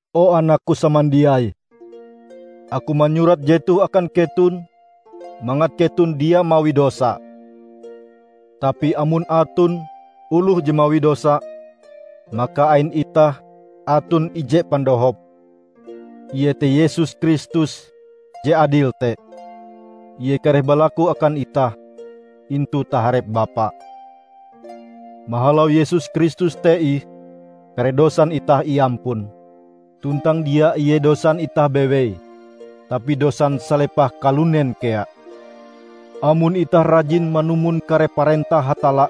O anakku samandiai! Aku manyurat jetoh akan keton mangat keton dia mawi dosa. Tapi amon aton oloh je mawi dosa, maka ain itah aton ije pandohop, iete Yesus Kristus je adil te; Ie kareh balaku akan itah intu taharep Bapa. Mahalau Yesus Kristus te ih kare dosan itah iampun. Tuntang dia ie dosan itah bewei, tapi dosan salepah kalunen kea. Amon itah rajin manumon kare parentah Hatalla,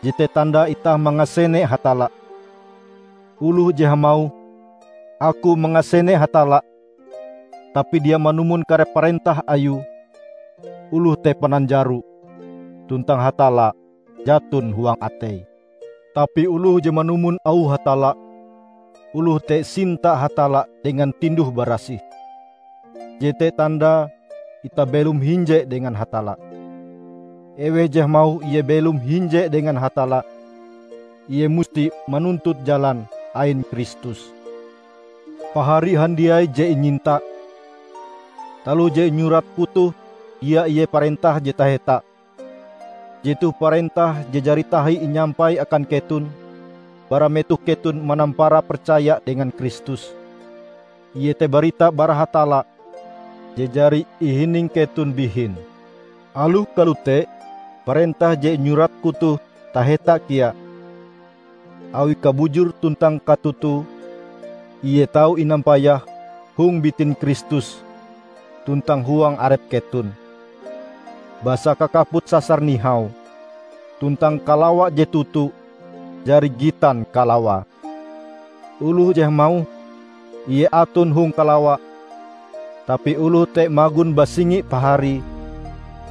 jete tandae itah mangasene Hatalla. Oloh je hamauh, "Aku mangasene Hatalla," tapi dia manumon kare parentah Ayue, oloh te pananjaro, tuntang Hatalla jaton huang ateie. Tapi oloh je manumon auh Hatalla, oloh te sinta Hatalla dengan tinduh-barasih. Jete tandae itah belom hinje dengan Hatalla. Eweh je hamauh ie belom hinje dengan Hatalla, ie musti manuntut jalan ain Kristus. Pahari handiai je inyinta! Taloh je inyuratku toh dia ie parentah je taheta. Jetoh parentah je jari tahi inyampai akan keton bara metoh keton manampara percaya dengan Kristus; iete barita bara Hatalla je jari ihining keton bihin. Aloh kalote, parentah je inyuratku toh taheta kea; awi kabujur tuntang katotoe Ie tau inampayah hong bitin Kristus tuntang huang arep keton. Basa kakaput sasar nihau tuntang kalawa je toto jari gitan kalawae. Oloh je hamauh ie aton hong kalawa tapi oloh te magon basingi paharie,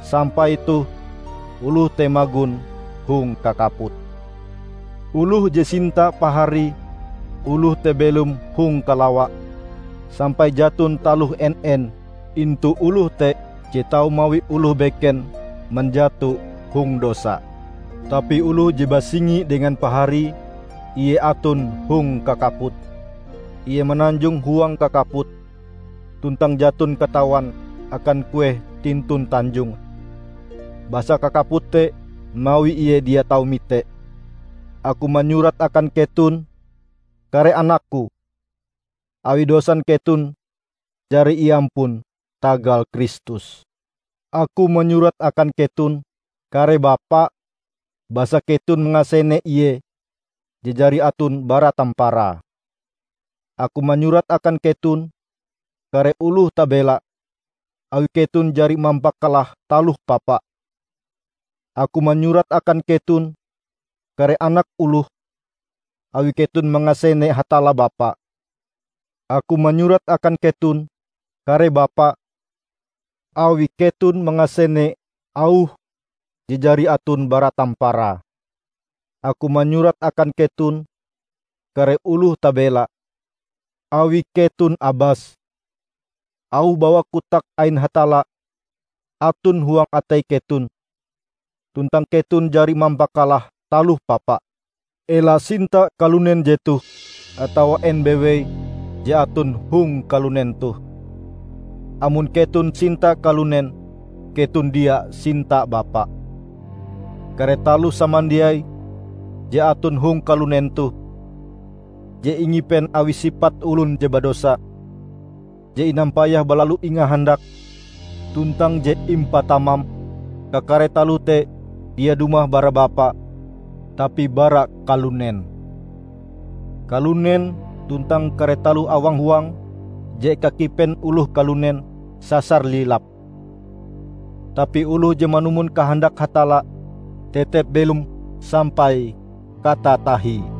sampai toh oloh te magon hong kakaput. Oloh je sinta paharie oloh te belom hong kalawa sampai jaton taloh en-en intu oloh te je tau mawi oloh beken manjato hong dosa. Tapi oloh je basingi dengan paharie, ie aton hong kakaput. Ie mananjong huang kakaput, tuntang jaton katawan akan kueh tintun tanjonge, basa kakaput te mawi ie dia tau mite. Aku manyurat akan keton, kare Anakku, awi dosan keton jari iampun tagal Kristus. Aku manyurat akan keton, kare bapa, basa keton mangasene Ie je jari aton bara tamparae. Aku manyurat akan keton, kare oloh tabela, awi keton jari mampakalah Taloh Papa. Aku manyurat akan keton, kare anak oloh, awi keton mangasene Hatalla Bapa. Aku manyurat akan keton, kare Bapa, awi keton mangasene Auh je jari aton bara tamparae. Aku manyurat akan keton, kare oloh tabela, awi keton abas. Auh bawak kotak ain Hatalla aton huang atei keton, tuntang keton jari mampakalah Taloh Papa. Ela sinta kalunen jetoh atawa en bewei je aton hong kalunen toh. Amon keton sinta kalunen keton dia sinta Bapa. Kare taloh samandiai je aton hong kalunen toh -- je ingipen awi sipat olon je badosa, je inampayah balalu ingahandak tuntang je impatamam -- kakare taloh te dia dumah bara Bapa tapi bara kalunen. Kalunen tuntang kare taloh awang huange je eka kipen oloh kalunen, sasar lilap. Tapi oloh je manumon kahandak Hatalla, tetep belom sampai katatahie.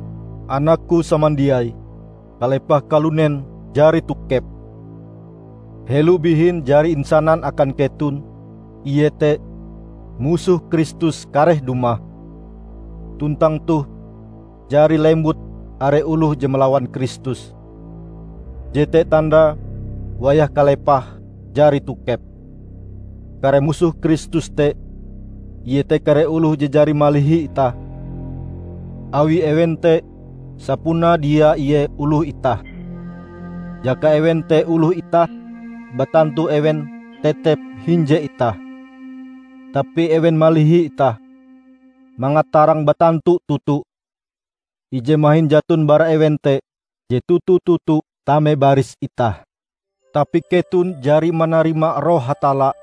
Anakku samandiai, kalepah kalunen jari tokep! Helo bihin jari insanan akan keton, iete, Musoh Kristus kareh dumah; tuntang toh jari lembut are oloh je malawan Kristus. Jete tandae wayah kalepahe jari tokep. Kare Musoh Kristus te iete kare oloh je jari malihi itah, awi ewen te sapunae dia ie oloh itah. Jaka ewen te oloh itah, batantu ewen tetep hinje itah. Tapi ewen malihi itah, mangat tarang batantu toto, ije mahin jaton bara ewen te je toto-toto tame baris itah. Tapi keton jari manarima Roh Hatalla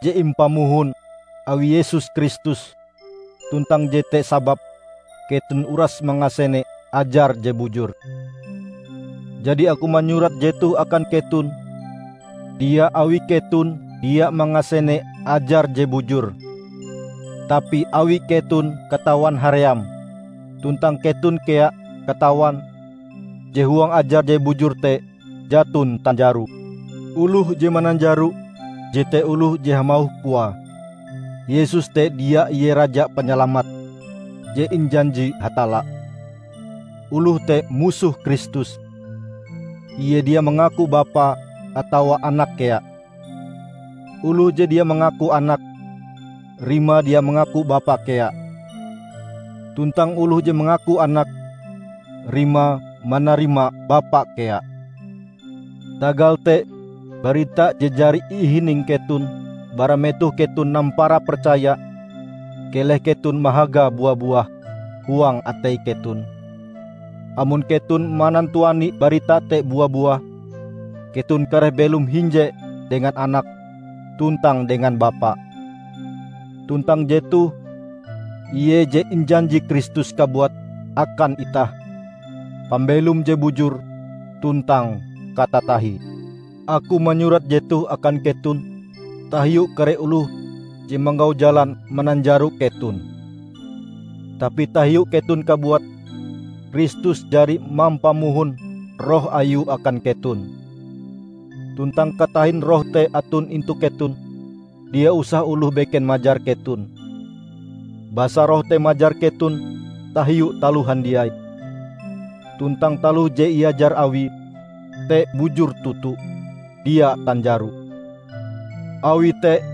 je impamohon awi Yesus Kristus tuntang jete sababe keton uras mangasene ajar je bujur. Jadi aku manyurat jetoh akan keton dia awi keton dia mangasene ajar je bujur, tapi awi keton katawan haream, tuntang keton kea katawan je huang ajar je bujur te jaton tanjaro. Oloh je mananjaro jete oloh je hamauh koae, Yesus te dia ie Raja Panyalamat je injanji Hatalla. Oloh te Musoh Kristus; ie dia mangaku Bapa atawa Anak kea. Oloh je dia mangaku Anak, rimae dia mangaku Bapa kea. Tuntang oloh je mangaku Anak, rimae manarima Bapa kea. Tagal te barita je jari ihining keton bara metoh keton nampara percaya keleh keton mahagae bua-buah huang atei keton. Amon keton manantuani barita te bua-buah keton kareh belom hinje dengan Anak tuntang dengan Bapa. Tuntang jetoh ie je injanji Kristus kabuat akan itah: pambelom je bujur tuntang katatahie. Aku manyurat jetoh akan keton tahiu kare oloh je manggau jalan mananjaro keton. Tapi tahiu keton kabuat, Kristus jari mampamohon Roh Ayue akan keton. Tuntang katahin Roh te aton intu keton, dia usah oloh beken majar keton. Basa Roh te majar keton tahiu taloh handiai; tuntang taloh je iajar Awie te bujur toto, dia tanjaro. Awi te,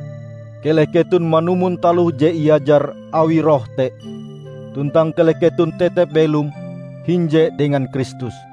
keleh keton manumon taloh je iajar awi Roh te, tuntang keleh keton tetep belom hinje dengan Kristus.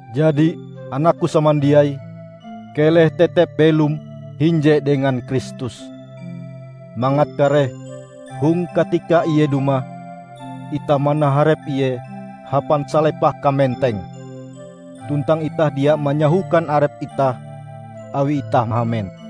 Jadi, anakku samandiai, keleh tetep belom hinje dengan Kristus, mangat kareh hong katika Ie dumah, itah manaharep Ie hapan salepah kamenteng, tuntang itah dia manyahokan arep itah awi itah mahamen.